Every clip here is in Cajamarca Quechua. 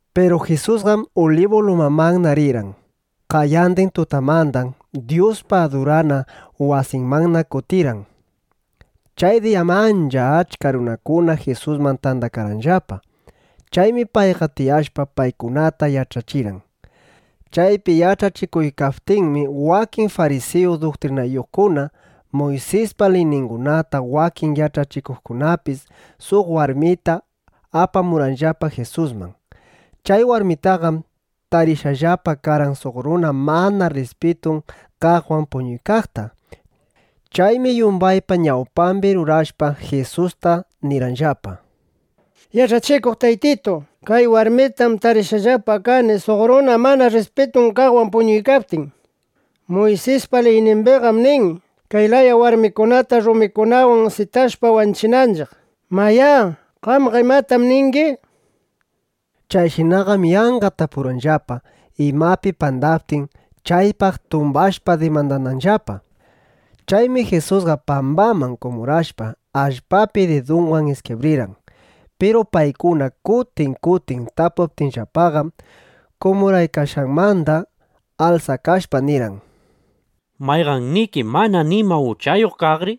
Piru Jisusqam Ulibu lumamanna rirqan. Qayandin tutamandam Dyuspa adurana wasinmanna kutirirqan. Chay diyam ancha achka runakuna Jisusman tandakarqanllapa. Chaymi payqa tiyashpa, paykunata yach'achirqan. Chaypi yach'achikuykaptinmi, wakin farisiyu duktrinayuqkuna, Muysispa liyningunata wakin yach'achikuqkunapis suq warmita apamurqanllapa Jisusman. Chay warmitaqam tarishqallapa karqan suq runa mana rrispitun kaqwan puñuykaqta. Chaymi yumbaypa ñawpambi rurashpa, Jisusta nirqanllapa: —Yach'achikuq Taytitu, kay warmitam tarishqallapa kani suq runa mana rrispitun kaqwan puñuykaptin. Muysispa liynimbiqam nin, kay laya warmikunata rumikunawan sitashpa, wanchinanchiq. Mayá, qamqa ¿imatam ningi? nishpa. Chayshinaqam yanqa tapurqanllapa, imapi pandaptin, chaypaq tumbashpa dimandananllapa. Chaymi Jisusqa pambaman kumurashpa, allpapi didunwan iskibrirqan. Piru paykuna kutin kutin tapuptinllapaqam, kumuraykashqanmanda alsakashpa, nirqan: —Mayqanniki mana nima uchayuq kaqri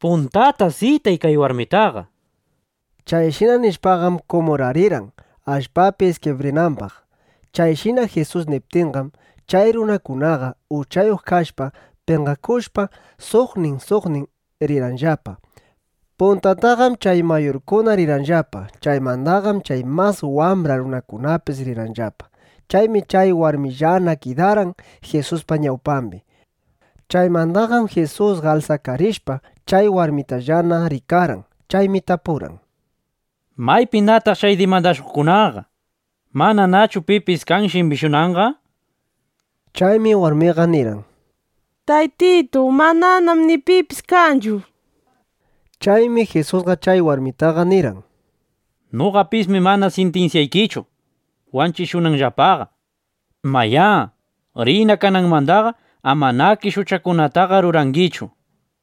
puntata sitay kay warmitaqa, nishpa. Chayshina nishpaqam kumurarirqan, allpapi iskibrinambaq. Chayshina Jisus niptinqam, chay runakunaqa, uchayuq kashpa, penqakushpa, suqnin suqnin rirqanllapa. Puntataqam chay mayurkuna rirqanllapa. Chaymandaqam chay mas wambra runakunapis rirqanllapa. Chaymi chay warmillana kidarqan Jisuspa ñawpambi. Chaymandaqam Jisusqa alsakarishpa, chay warmitallana rikarqan. Chaymi tapurqan: —¿Maypinataq chay dimandashuqkunaqa? ¿Mananachu pipis kan, shimbishunanqa? nishpa. Chaymi warmiqa nirqan: —Taytitu, mananam ni pipis kanchu, nishpa. Chaymi Jisusqa chay warmitaqa nirqan: —Noqapismi mana sintinsyaykichu wanchishunanllapaqa. Mayá, riyna. Kananmandaqa amanakish uchakunataqa rurangichu, nishpa.˼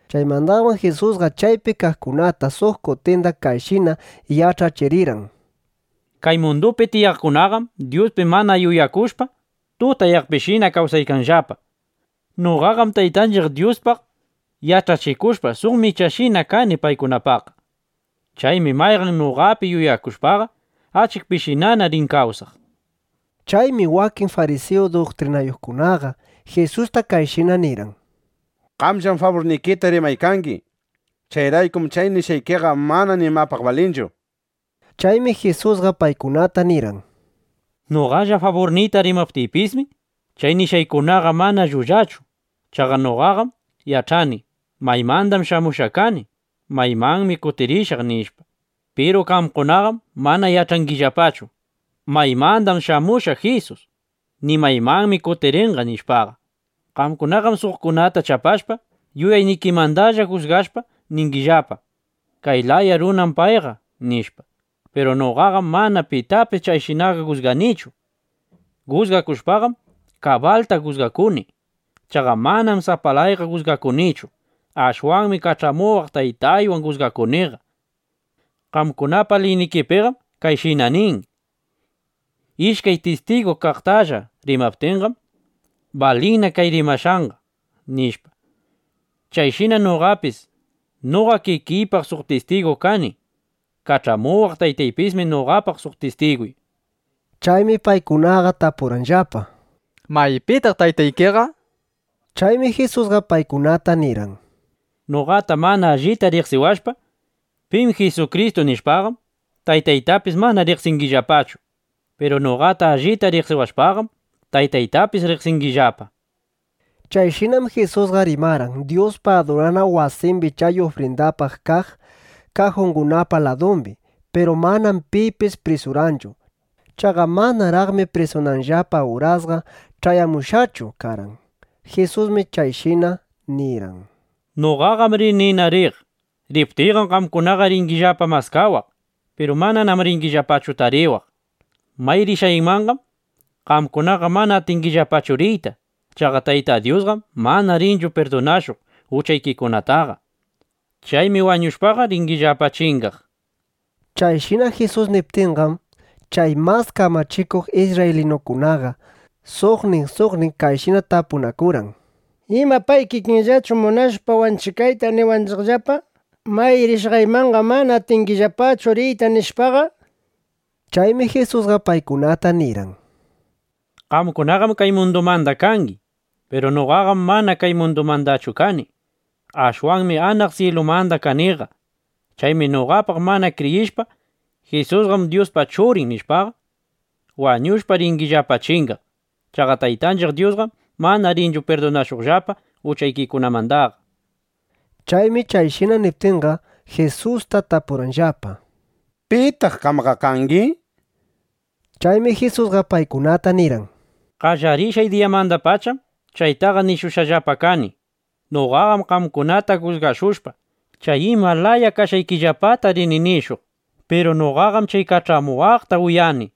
Chaymandaqam Jisusqa chaypi kaqkunata suq kutinda kayshina yach'achirirqan: —(Kay mundupi tiyaqkunaqam Dyuspi mana yuyakushpaqa, tutayaqpishina kawsaykanllapa.) Noqaqam Taytanchiq Dyuspaq yach'achikushpa, suq michashina kani paykunapaqqa. Chaymi mayqan runa noqapi yuyakushpaqa, achikpishinana rin kawsaq, nishpa. Chaymi wakin farisiyu duktrinayuqkunaqa Jisusta kayshina nirqan: —Qamllam faburnikita rimaykangi. Chayraykum chay nishqaykiqa mana nimapaq balinchu, nishpa. Chaymi Jisusqa paykunata nirqan: —Noqalla faburniyta rimaptiypismi, chay nishqaykunaqa mana llullachu. Chaqa noqaqam yach'ani: Maymandam shamushqa kani, maymanmi kutirishaq, nishpa. Piru qamkunaqam mana yach'angillapachu: Maymandam shamushqa Jisus, ni maymanmi kutirinqa, nishpaqa. Qamkunaqam suqkunata chapashpa, yuyaynikimandalla jusgashpa, ningillapa: “Kay laya runam payqa”, nishpa. Piru noqaqam mana pitapis chayshinaqa jusganichu. Jusgakushpaqam, kabalta jusgakuni. Chaqa manam sapalayqa jusgakunichu. Ashwanmi kach'amuwaq Taytaywan jusgakuniqa. Qamkunapa liynikipiqam kayshina nin: “Ishkay tistigu chay layatalla rimaptinqam, balinna chay rimashqanqa”, nishpa. Chayshinam noqapis noqa kikiypaq suq tistigu kani. Kach'amuwaq Taytaypismi noqapaq suq tistigu, nishpa. Chaymi paykunaqa tapurqanllapa: —¿Maypitaq taytaykiqa? nishpa. Chaymi Jisusqa paykunata nirqan: —Noqata mana allita riqsiwashpa: Pim Jisukristu nishpaqam, Taytaytapis mana riqsingillapachu. Piru noqata allita riqsiwashpaqam, Taytaytapis riqsingimanllapa, nishpa. Chayshinam Jisusqa rimarqan Dyuspa adurana wasimbi chay ufrindapaq kaq kajungunapa ladumbi. Piru manam pipis prisurqanchu. Chaqa manaraqmi prisunanllapa urasqa ch'ayamushqachu karqan. Jisusmi kayshina nirirqan: —Noqaqam rinina riq. Riptiyqam qamkunaqa ringillapa maskawaq. (Piru mananam ringillapachu tariwaq.) May rishqaymanqam qamkunaqa mana atingillapachu riyta. Chaqa Tayta Dyusqam mana rinchu pirdunashuq uchaykikunataqa. Chaymi wañushpaqa, ringillapa chingaq, nishpa. Chayshina Jisus niptinqam, chay mas kamachikuq isrraylinukunaqa suqnin suqnin kayshina tapunakurqan: —¿Ima pay kikinllachu munashpa wanchikayta, niwanchiqllapa: “May rishqaymanqam mana atingillapachu riyta” nishpaqa? Chaymi Jisusqa paykunata nirqan: —Qamkunaqam kay mundumanda kangi. Piru noqaqam mana kay mundumandachu kani. Ashwanmi anaq syilumanda kaniqa. Chaymi noqapaq mana kriyishpa: Jisusqam Dyuspa Churin, nishpaqa, wañushpa ringillapa chingaq. Chaqa Taytanchiq Dyusqam mana rinchu pirdunashuqllapa uchaykikunamandaqa, nishpa. Chaymi chayshina niptinqa, Jisusta tapurqanllapa: —¿Pitaq qamqa kangi? nishpa. Chaymi Jisusqa paykunata nirqan: —Qallarishqay diyamandapacham chaytaqa nishushqallapa kani. Noqaqam qamkunata jusgashushpa, chay ima laya kashqaykillapata rini nishuq. Piru noqaqam chay kach'amuwaqta uyani.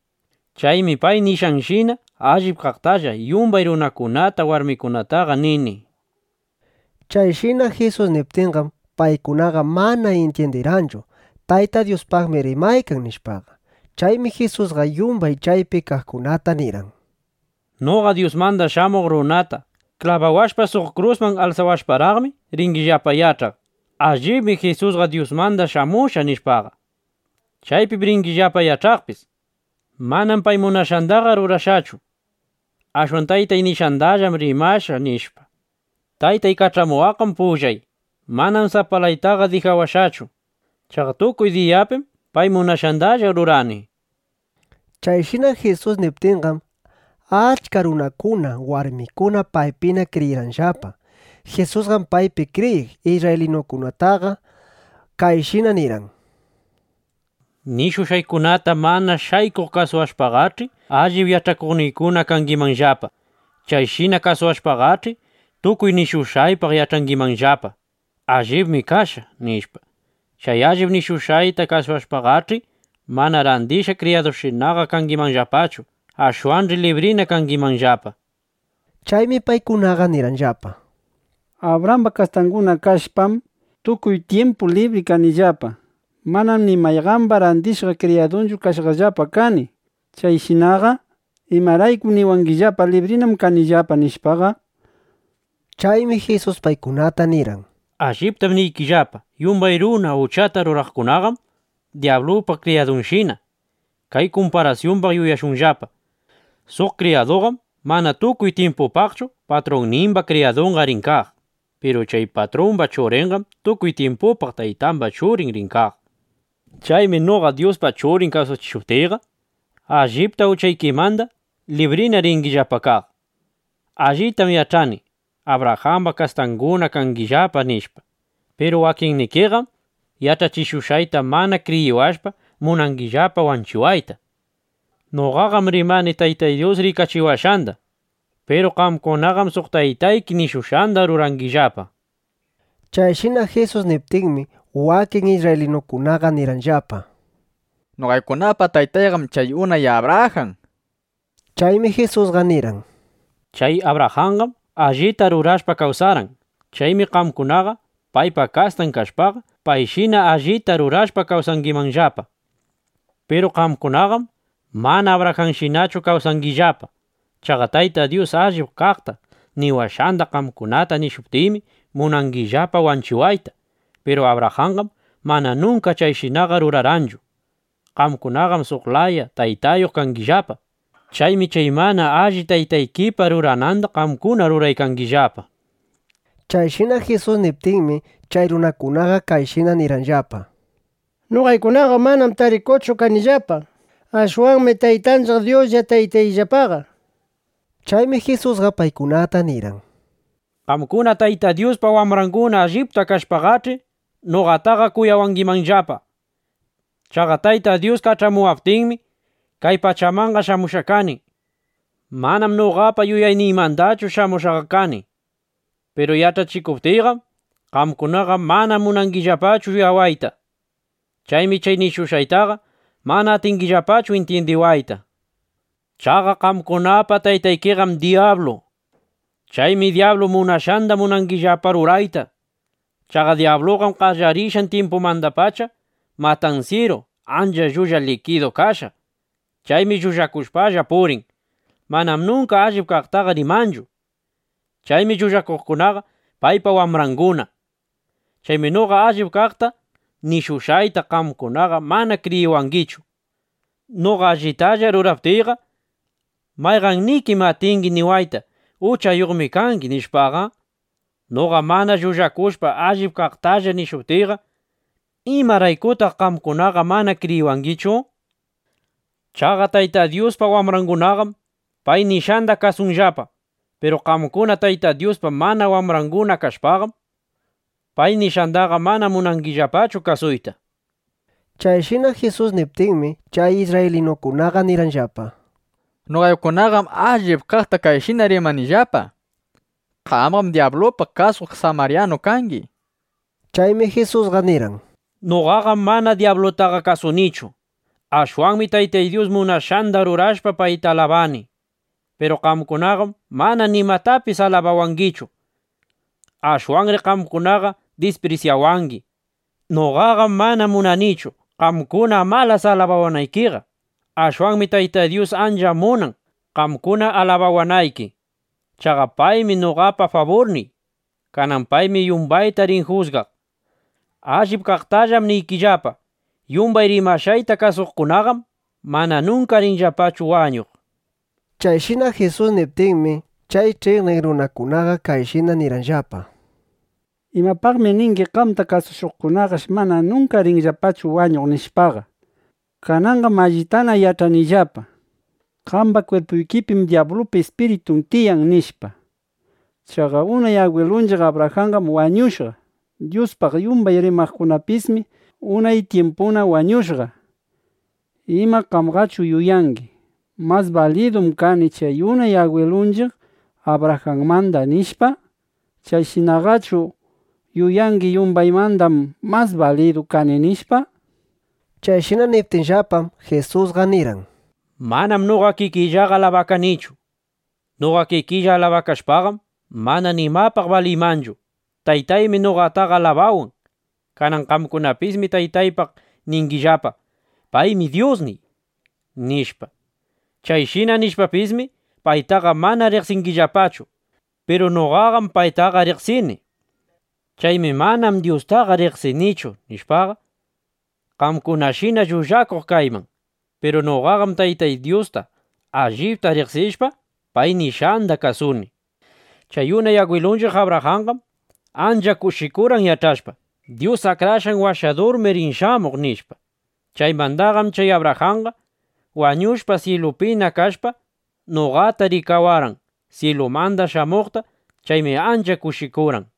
Chaymi pay nishqanshina allip kaqtalla yumbay runakunata, warmikunataqa nini. Chayshina Jisus niptinqam, paykunaqa mana intyindirqanchu: Tayta Dyuspaqmi rimaykan, nishpaqa. Chaymi Jisusqa yumbay chaypi kaqkunata nirqan: —Noqa Dyusmanda Shamuq Runata (klabawashpa, suq krusman) alsawashparaqmi, ringillapa yach'aq: Allibmi Jisusqa Dyusmanda shamushqa, nishpaqa. Chaypim ringillapa yach'aqpis: Manam pay munashqandaqa rurashqachu. Ashwan Taytan nishqandallam rimashqa, nishpa. Taytay kach'amuwaqqam pullay. Manam sapalaytaqa dijawashqachu. Chaqa tukuy bidaypim pay munashqandalla rurani. Chayshina Jisus niptinqam, achka runakuna, warmikuna paypina kriyirqanllapa. Jisusqam paypi kriyiq isrraylinukunataqa kayshina nirqan: —Nishushqaykunata mana shaykuq kasuwashpaqach'i, allip yach'akuqniykuna kangimanllapa. Chayshina kasuwashpaqach'i, tukuy nishushqaypaq yach'angimanllapa: Allibmi kashqa, nishpa. Chay allip nishushqayta kasushpaqach'i, manana randishqa kriyadushinaqa kangimanllapachu. Ashwanch'i librina kangimanllapa, nishpa. Chaymi paykunaqa nirqanllapa: —Abrajamba kastanguna kashpam, tukuy tyimpu libri kanillapa. Manam ni mayqamba randishqa kriyadunchu kashqallapa kani. Chayshinaqa ¿imaraykum niwangillapa: “Librinam kangimanllapa”, nishpaqa? Chaymi Jisusqa paykunata nirqan: —Alliptam niykillapa, yumbay runa uchata ruraqkunaqam dyablupa kriyadunshina. Kay kumparasyumbaq yuyashunllapa: Suq kriyaduqam mana tukuy tyimpupaqchu patrunnimba kriyadunqa rin kaq. Piru chay patrumba churinqam tukuy tyimpupaq taytamba churin rin kaq. Chaymi noqa Dyuspa Churin washashuptiyqa, allipta uchaykimanda librina ringillapa kaq. Allitam yach'ani: Abrajamba kastanguna kangillapa, nishpa. Piru wakinnikiqam yach'achishushqayta mana kriyiwashpa, munangillapa wanchiwayta. Noqaqam rimani Taytay rikachiwashqanda. Piru qamkunaqam suq taytayki nishushqanda rurangillapa. Chayshina Jisus niptinmi, wakin isrraylinukunaqa nirqanllapa: —Noqaykunapa taytayqam chay unay Abrajan, nishpa. Chaymi Jisusqa nirqan: —Chay Abrajanqam allita rurashpa kawsarqan. Chaymi qamkunaqa paypa kastan kashpaqa, payshina allita rurashpa kawsangimanllapa. Piru qamkunaqam mana Abrajanshinachu kawsangillapa. Chaqa Tayta Dyus allip kaqta niwashqanda qamkunata nishuptiymi, munangillapa wanchiwayta. Piru Abrajanqam mana nunka chayshinaqa rurarqanchu. Qamkunaqam suq laya taytayuq kangillapa. Chaymi chay mana alli taytaykipa rurananda qamkuna ruraykangillapa. Chayshina Jisus niptinmi, chay runakunaqa kayshina nirqanllapa: —Noqaykunaqam mana tarikuchu kanillapa. Ashwanmi Taytanchiq Dyuslla taytayllapaqa, nishpa. Chaymi Jisusqa paykunata nirqan: —Qamkuna Tayta Dyuspa wambranguna allipta kashpaqach'i, noqataqa kuyawangimanllapa. Chaqa Tayta Dyus kach'amuwaptinmi, kay pachamanqa shamushqa kani. Manam noqapa yuyayniymandachu shamushqaqa kani. Piru yach'achikuptiyqam, qamkunaqa mana munangillapachu uyawayta. Chaymi chay nishushqaytaqa mana atingillapachu intyindiwayta. Chaqa qamkunapa taytaykiqam dyablu. Chaymi dyablu munashqanda munangillapa rurayta. Chaqa dyabluqam qallarishqan tyimpumandapacha matansyiru, ancha llulla likidu kashqa. Chaymi llullakushpalla purin. Manam nunka allip kaqtaqa rimanchu. Chaymi llullakuqkunaqa paypa wambranguna. Chaymi noqa allip kaqta nishuptiyqa, qamkunaqa mana kriyiwangichu. Noqa allitalla ruraptiyqa, ¿mayqannikim atingi niwayta: “Uchayuqmi kangi”, nishpaqa? Noqa mana llullakushpa, allip kaqtalla nishuptiyqa ¿imaraykutaq qamkunaqa mana kriyiwangichu? Chaqa Tayta Dyuspa wambrangunaqam pay nishqanda kasunllapa. Piru qamkuna Tayta Dyuspa mana wambranguna kashpaqam, pay nishqandaqa mana munangillapachu kasuyta. Chayshina Jisus niptinmi, chay isrraylinukunaqa nirqanllapa: —Noqaykunaqam allip kaqta kayshina rimanillapa: “Qamqam dyabluta kasuq samaryanu kangi”, nishpa. Chaymi Jisusqa nirqan: —Noqaqam mana dyablutaqa kasunichu. Ashwanmi Taytay munashqanda rurashpa, payta alabani. Piru qamkunaqam mana nimatapis alabawangichu. Ashwanmi qamkunaqa disprisyawangi. Noqaqam mana munanichu, qamkuna amalas alabawanaykiqa. Ashwanmi Taytay Dyus ancha munan, qamkuna alabawanayki. Chaqa paymi noqapa faburniy. Kanan paymi yumbayta rin jusgaq. Allip kaqtallam niykillapa, yumbay rimashqayta kasuqkunaqam mana nunka rinllapachu wañuq, nishpa. Chayshina Jisus niptinmi, chay ch'iqniq runakunaqa kayshina nirqanllapa: —¿Imapaqmi ningi qamta kasushuqkunash mana nunka rinllapachu wañuq, nishpaqa? Kananqam allitana yach'anillapa: Qamba kwirpuykipim dyablupa ispiritun tiyan, nishpa. Chaqa unay agwilunchiq Abrajanqam wañushqa. Dyuspaq yumbay rimaqkunapismi unay tyimpuna wañushqa. ¿Ima qamqachu yuyangi: Mas balidum kani chay unay agwilunchiq Abrajanmanda, nishpa? Chayshinaqachu ¿yuyangi: Yumbaymandam mas balidu kani, nishpa? Chayshina niptinllapam, Jisusqa nirqan: —Manam noqa kikiyllaqa alabakanichu. Noqa kikiylla alabakashpaqam, mana nimapaq baliymanchu. Taytaymi noqataqa alabawan. Kanan qamkunapismi Taytaypaq ningillapa: “Paymi Dyusniy”, nishpa. Chayshina nishpapismi, paytaqa mana riqsingillapachu. Piru noqaqam paytaqa riqsini. Chaymi “Manam Dyustaqa riqsinichu”, nishpaqa, qamkunashina llullakuq kayman. Piru noqaqam Taytay Dyusta allipta riqsishpa, pay nishqanda kasuni. Chay unay agwilunchiq Abrajanqam ancha kushikurqan, yach'ashpa: Dyus Akrashqan Washadurmi rin shamuq, nishpa. Chaymandaqam chay Abrajanqa (wañushpa, syilupina kashpa) noqata rikawarqan syilumanda shamuqta. Chaymi ancha kushikurqan.